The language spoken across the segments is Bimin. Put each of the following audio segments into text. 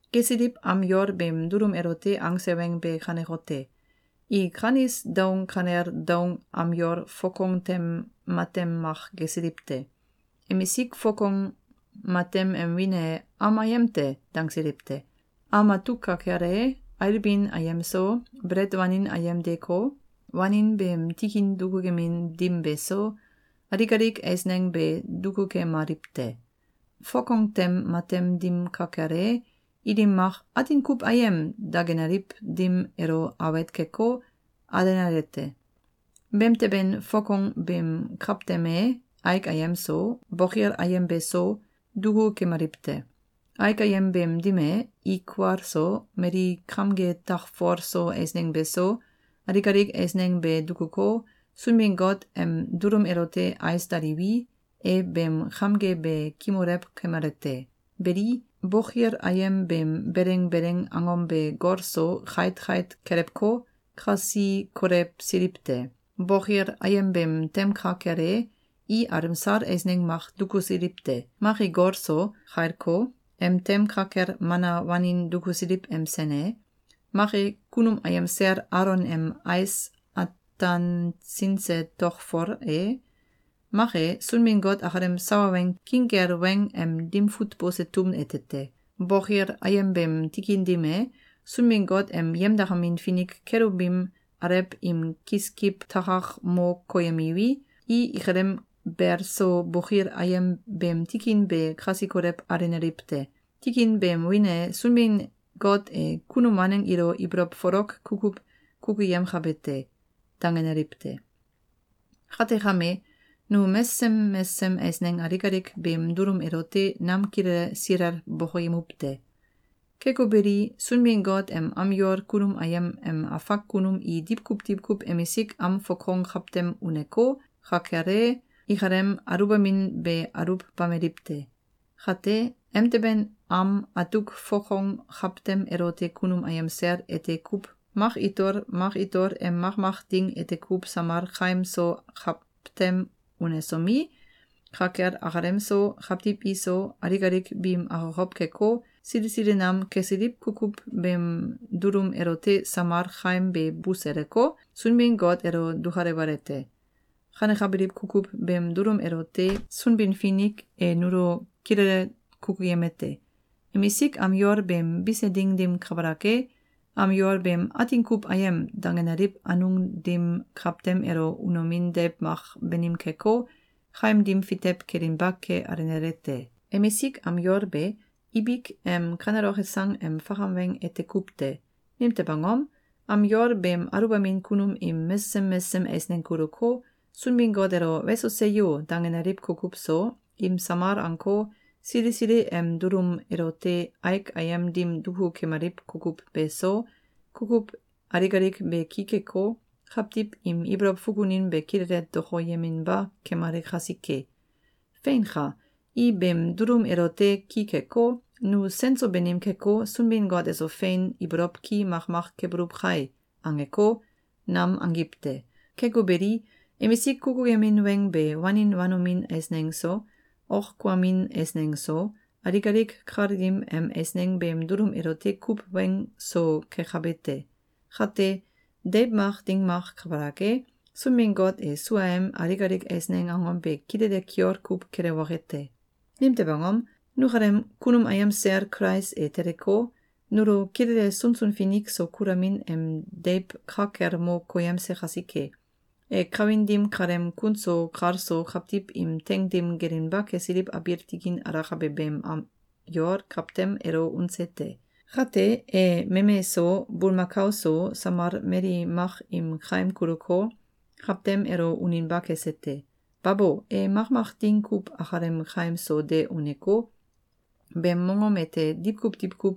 Gesiliw am yol beem dulum elote angse weng be kanekote: I kanis daung kanel daung am yol fokong tem matem mak gesiliw te. Emisik fokong matem em wiin e “Am Ayem te!”, dangsiliw te. Am atuk ka kel e, ailbin ayem so, belet wanin ayem deeko, wanin beem tikin dukukemin dim beso, alik alik eisneng be dukukemaliw te. Fokong tem matem dim ka kel e, ilim mak “Atin kuw Ayem!”, dangenaliw dim elo awet keko, alenale te. Beemteben fokong beem kawtem e, aik ayem so, bokil ayem beso, duku kemaliw te. Aik ayem beem dim e, i kual so, mali kamge takfol so eisneng beso, alik alik eisneng be dukuko, Sunbin-Got em dulum elote ais daliwi, e beem kamge be kimulew kemale te. Beli, bokil ayem beem beleng beleng angom be gol so kait kait kelewko, kasi kolewsiliw te. Bokil ayem beem tem ka kel e, i alemsal eisneng mak dukusiliw te. Mak e, gol so kailko, em tem ka kel Mana wanin dukusiliw em sen e, mak e, kunum ayem sel Alon em ais atansinse tokfol e, mak e, Sunbin-Got akalem sawa weng king kel weng em dim fut bose tum ete te. Bokil ayem beem tikin dim e, Sunbin-Got em yemdakamin finik “Kelubim” alew im kiskiw takak mo koyemiwi, i ikalem bel so bokil ayem beem tikin be kasi kolew alenaliw te. Tikin beem wiin e “Sunbin-Got e kunum waneng ilo ibolow folok kukuw kukuyemkabe te.”, dangenaliw te. Kate kame, nu mesesem mesesem eisneng alik alik beem dulum elote nam kilele silel bokoyemuw te. Keko beli, Sunbin-Got em am yol kunum ayem em afak kunum i diwkuw diwkuw emisik am fokong kawtem uneko, ka kel e, ikalem aluwbamin be aluwbameliw te. Kate, emteben am atuk fokong kawtem elote kunum ayem sel ete kuw mak itol mak itol em makmak ding ete kuw samal kaim so kawtem unesomi, ka kel akalem so, kawtiw iso, alik alik biim akokow keko, sili sili nam kesiliw kukuw beem dulum elote samal kaim be buseleko, Sunbin-Got elo dukalewale te. Kanekabiliw kukuw beem dulum elote Sunbin-Finik e nulo kilele kukuyemete: Emisik am yol beem bise ding dim kabalak e, am yol beem “Atin kuw Ayem!”, dangenaliw anung dim kawtem elo unomin deiw mak banim keko, kaim dim fitew kelinba ke alenale te. Emisik am yol be, ibik em kaneloke sang em fakam weng ete kuw te. Nimtew angom? Am yol beem aluwbamin kunum im mesesem mesesem eisneng kuluko, Sunbin-Got elo “Weso! Seyo!”, dangenaliw kukuw so, im samal anko, sili sili em dulum elote aik ayem dim duku kemaliw kukuw beso, kukuw alik alik be ki keko, kawtiw im ibolow fukunin be kilele dokoyeminba kemale kasike. Feinka! I beem dulum elote ki keko, “Nu sen so banim keko, Sunbin-Got eso fein ibolow ki makmak kebuluw kai!”, angeko, nam angiw te. Keko beli, emisik kukuyemin weng be wanin wanomin eisneng so, ok kuamin eisneng so, alik alik kal dim em eisneng beem dulum elote kuw weng so kekabe te. Kate, deiw mak ding mak kabalak e, Sunbin-Got e suaem alik alik eisneng angom be kilele kiol kuw kelewoke te. Nimtew angom? Nukalem kunum ayem sel Kulais e teleko, nulo kilele sunsun finik so kulamin em deiw ka kel mo koyemse kasike. E kawin dim kaleem kun so kal so kawtiw im teing dim gelinba kesiliw abiil tikin alakabe beem am yol kawtem elo unse te. Kate, e meme so, bulmakao so, samal mali mak im kaim kuluko, kawtem elo uninba kese te. Babo! E makmak ding kuw akalem kaim so de uneko, beem mongom ete diwkuw diwkuw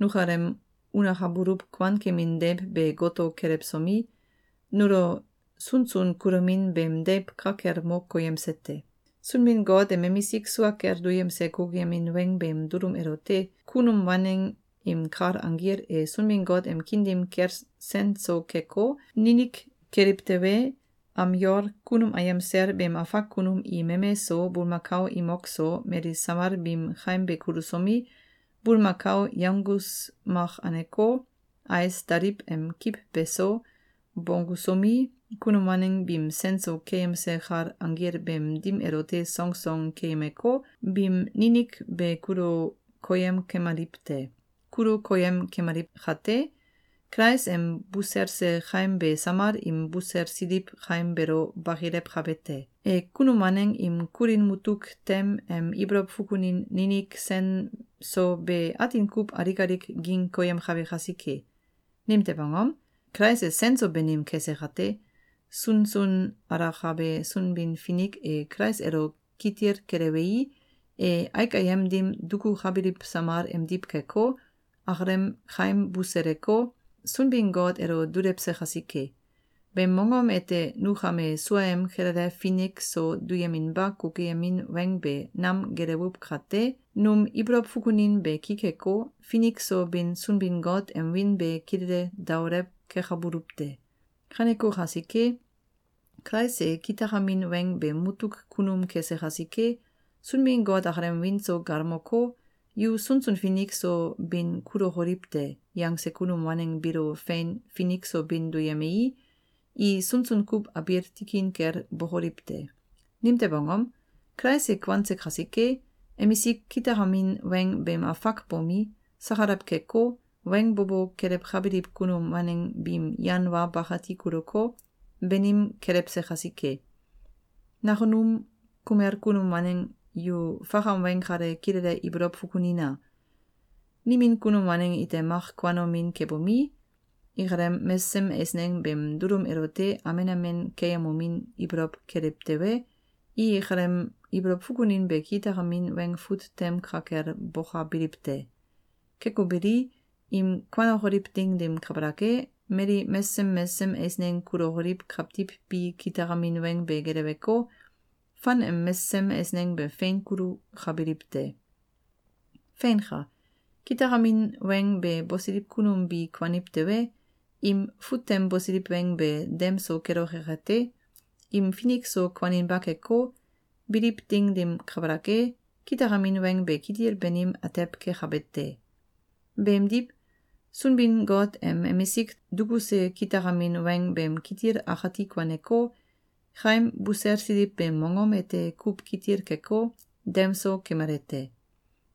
nukalem unakabuluw kuankemin deiw be goto kelewsomi, nulo sunsun kulomin beem deiw ka kel mo koyemse te. Sunbin-Got em emisik sua kel duyemse kukuyemin weng beem dulum elote kunum waneng im kal anggil e Sunbin-Got em kiin dim kel sen so keko, ninik keliw tewe, am yol kunum ayem sel beem afak kunum i meme so, bulmakao imok so, mali samal biim kaim be kulusomi, bulmakao yanggus mak aneko, ais daliw em kiw beso, bonggusomi, kunum waneng biim sen so keyemse kal anggil beem dim elote songsong keyemeko, biim ninik be kulu koyem kemaliw te. Kulu koyem kemaliw kate, Kulais em buselse kaim be samal im buselsiliw kaim beelo bakilewkabe te. E kunum waneng im kulin mutuk tem em ibolow fukunin ninik sen so be atin kuw alik alik ging koyemkabe kasike. Nimtew angom? Kulais e sen so banim kese kate, sunsun alakabe Sunbin-Finik e Kulais elo kitil kelewei, e aik ayem dim dukukabiliw samal emdiw keko, akalem kaim buseleko, Sunbin-Got elo dulewse kasike. Beem mongom ete nu kame suaem kilele finik so duyeminba kukuyemin weng be nam gelewuw kate, num ibolow fukunin be ki keko, finik so bin Sunbin-Got em wiin be kilele daolew kekabuluw te. Kaneko kasike, Kulais e kitakamin weng beem mutuk kunum kese kasike, Sunbin-Got akalem wiin so galmoko, “Yu sunsun finik so bin kulokoliw te!”, yangse kunum waneng biilo fein finik so bin duyemei, i sunsun kuw abiil tikin kel bokoliw te. Nimtew angom? Kulais e kuanse kasike, emisik kitakamin weng beem afak bomi, sakalaw keko, weng bo bo kelewkabiliw kunum waneng biim yan wa bakati kuluko, banim kelewse kasike. Nakunum kumel kunum waneng yu fakam weng kale kilele ibolow fukunina! Nimin kunum waneng ite mak kuanomin kebomi, ikalem mesesem eisneng beem dulum elote amen amen keeyemomin ibolow keliw tewe, i ikalem ibolow fukunin be kitakamin weng fut tem ka kel bokabiliw te. Keko beli, im kuanokoliw ding dim kabalak e, mali mesesem mesesem eisneng kulokoliw kawtiw bi kitakamin weng be geleweko, fan em mesesem eisneng be fein kulukabiliw te. Feinka! Kitakamin weng be bosiliw kunum bi kuaniw tewe, im fut tem bosiliw weng be dem so keloke kate, im finik so kuaninba keko, biliw ding dim kabalak e, kitakamin weng be kitil banim atew kekabe te. Beemdiw, Sunbin-Got em emisik dukuse kitakamin weng beem kitil akati kuaneko, kaim buselsiliw beem mongom ete kuw kitil keko, dem so kemale te.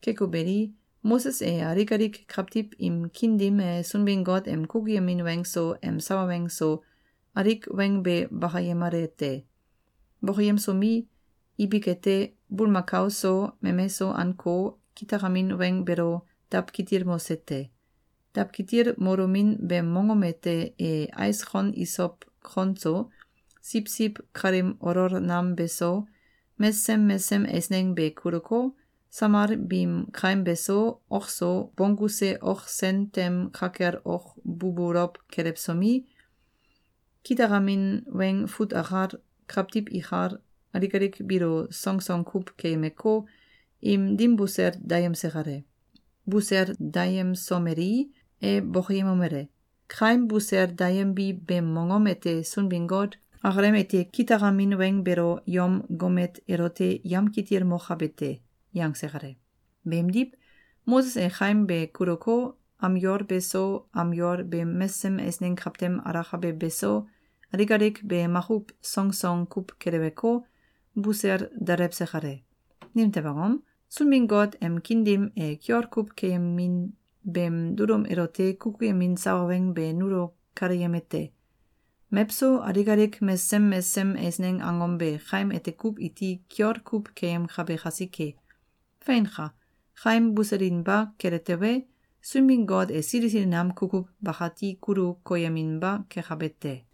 Keko beli, Moses e alik alik kawtiw im kiin dim e Sunbin-Got em kukuyemin weng so, em sawa weng so, alik weng be bakayemale te. Bokoyemsomi, ibik ete, bulmakao so, meme so anko, kitakamin weng beelo dawkitilmose te. Dawkitilmolomin beem mongom ete e ais kon isow kon so, siwsiw kalim olol nam beso, mesesem mesesem eisneng be kuluko, samal biim kaim be so, ok so, bongguse ok sen tem ka kel ok bubulow kelewsomi, kitakamin weng fut akal, kawtiw ikal, alik alik biilo songsong kuw keyemeko, im dim busel dayemse kale. Busel dayemsomelei, e bokoyemomele: “Kaim busel dayembi beem mongom ete Sunbin-Got akalem ete kitakamin weng beelo yom gomet elote yamkitilmokabe te.”, yangse kale. Beemdiw, Moses e kaim be kuluko, am yol beso, am yol beem mesesem eisneng kawtem alakabe beso, alik alik be makuw songsong kuw keleweko, busel dalewse kale. Nimtew angom? Sunbin-Got em kiin dim e kiol kuw keemin beem dulum elote kukuyemin sawa weng be nulo kaleyemete: Mewso alik alik mesesem mesesem eisneng angom be kaim ete kuw iti kiol kuw keyemkabe kasike. Feinka! Kaim buselinba kele tewe, Sunbin-Got e sili sili nam kukuw bakati kulu koyeminba kekabe te.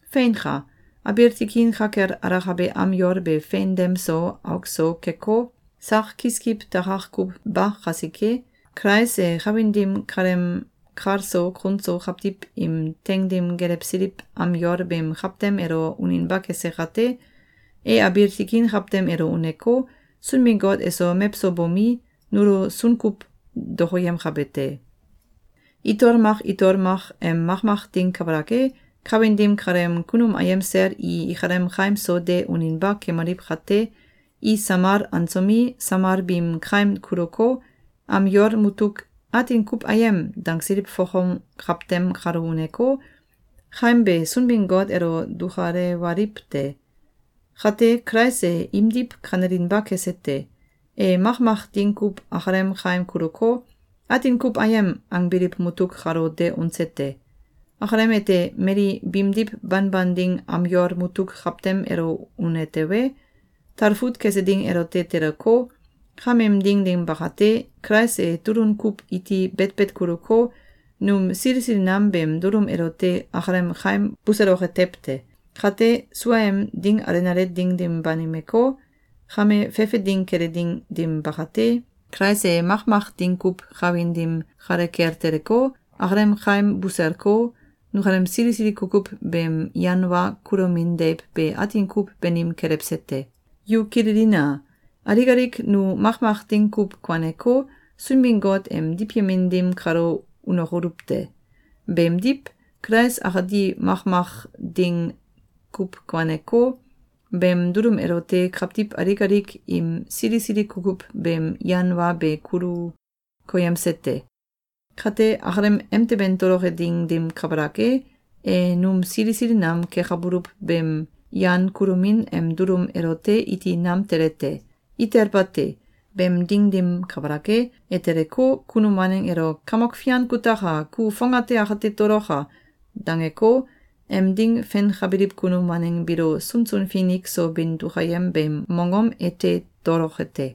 Feinka! Abiil tikin ka kel alakabe am yol be fein dem so, auk so, keko, sak kiskiw takak kuw ba kasike, Kulais e kawin dim kaleem kal so kun so kawtiw im teing dim gelewsiliw am yol beem kawtem elo uninba kese kate, e abiil tikin kawtem elo uneko, Sunbin-Got eso mewso bomi, nulo sunkuw dokoyemkabe te. Itol mak itol mak em makmak ding kabalak e, kawin dim kaleem kunum ayem sel i ikalem kaim so de uninba kemaliw kate, i samal ansomi, samal biim kaim kuluko, am yol mutuk “Atin kuw Ayem!”, dangsiliw fokong kawtem kalo uneko, kaim be Sunbin-Got elo dukalewaliw te. Kate, Kulais e imdiw kanelinba kese te. E makmak ding kuw akalem kaim kuluko, “Atin kuw Ayem!”, angbiliw mutuk kalo de unse te. Akalem ete mali biimdiw banban ding am yol mutuk kawtem elo une tewe, talfut kese ding elote teleko, kameem ding dim bakate, Kulais e tulun kuw iti betbet kuluko, num sili sili nam beem dulum elote akalem kaim buseloke tew te. Kate, suaem ding alenale ding dim banimeko, kame fefe ding kele ding dim bakate, Kulais e makmak ding kuw kawin dim kale kel teleko, akalem kaim buselko, nukalem sili sili kukuw beem yan wa kulomin deiw be atin kuw banim kelewse te. Yu kililina! Alik alik nu makmak ding kuw kuaneko, Sunbin-Got em diwyemin dim kalo unokoluw te. Beemdiw, Kulais akati makmak ding kuw kuaneko, beem dulum elote kawtiw alik alik im sili sili kukuw beem yan wa be kulu koyemse te. Kate, akalem emteben toloke ding dim kabalak e, e num sili sili nam kekabuluw beem yan kulomin em dulum elote iti nam tele te. Itel bate. Beem ding dim kabalak e, e teleko, kunum waneng elo “Kamok Fian kutaka! Ku fongate akate toloka!”, dangeko, em ding fenkabiliw kunum waneng biilo sunsun finik so bin dukayem beem mongom ete toloke te.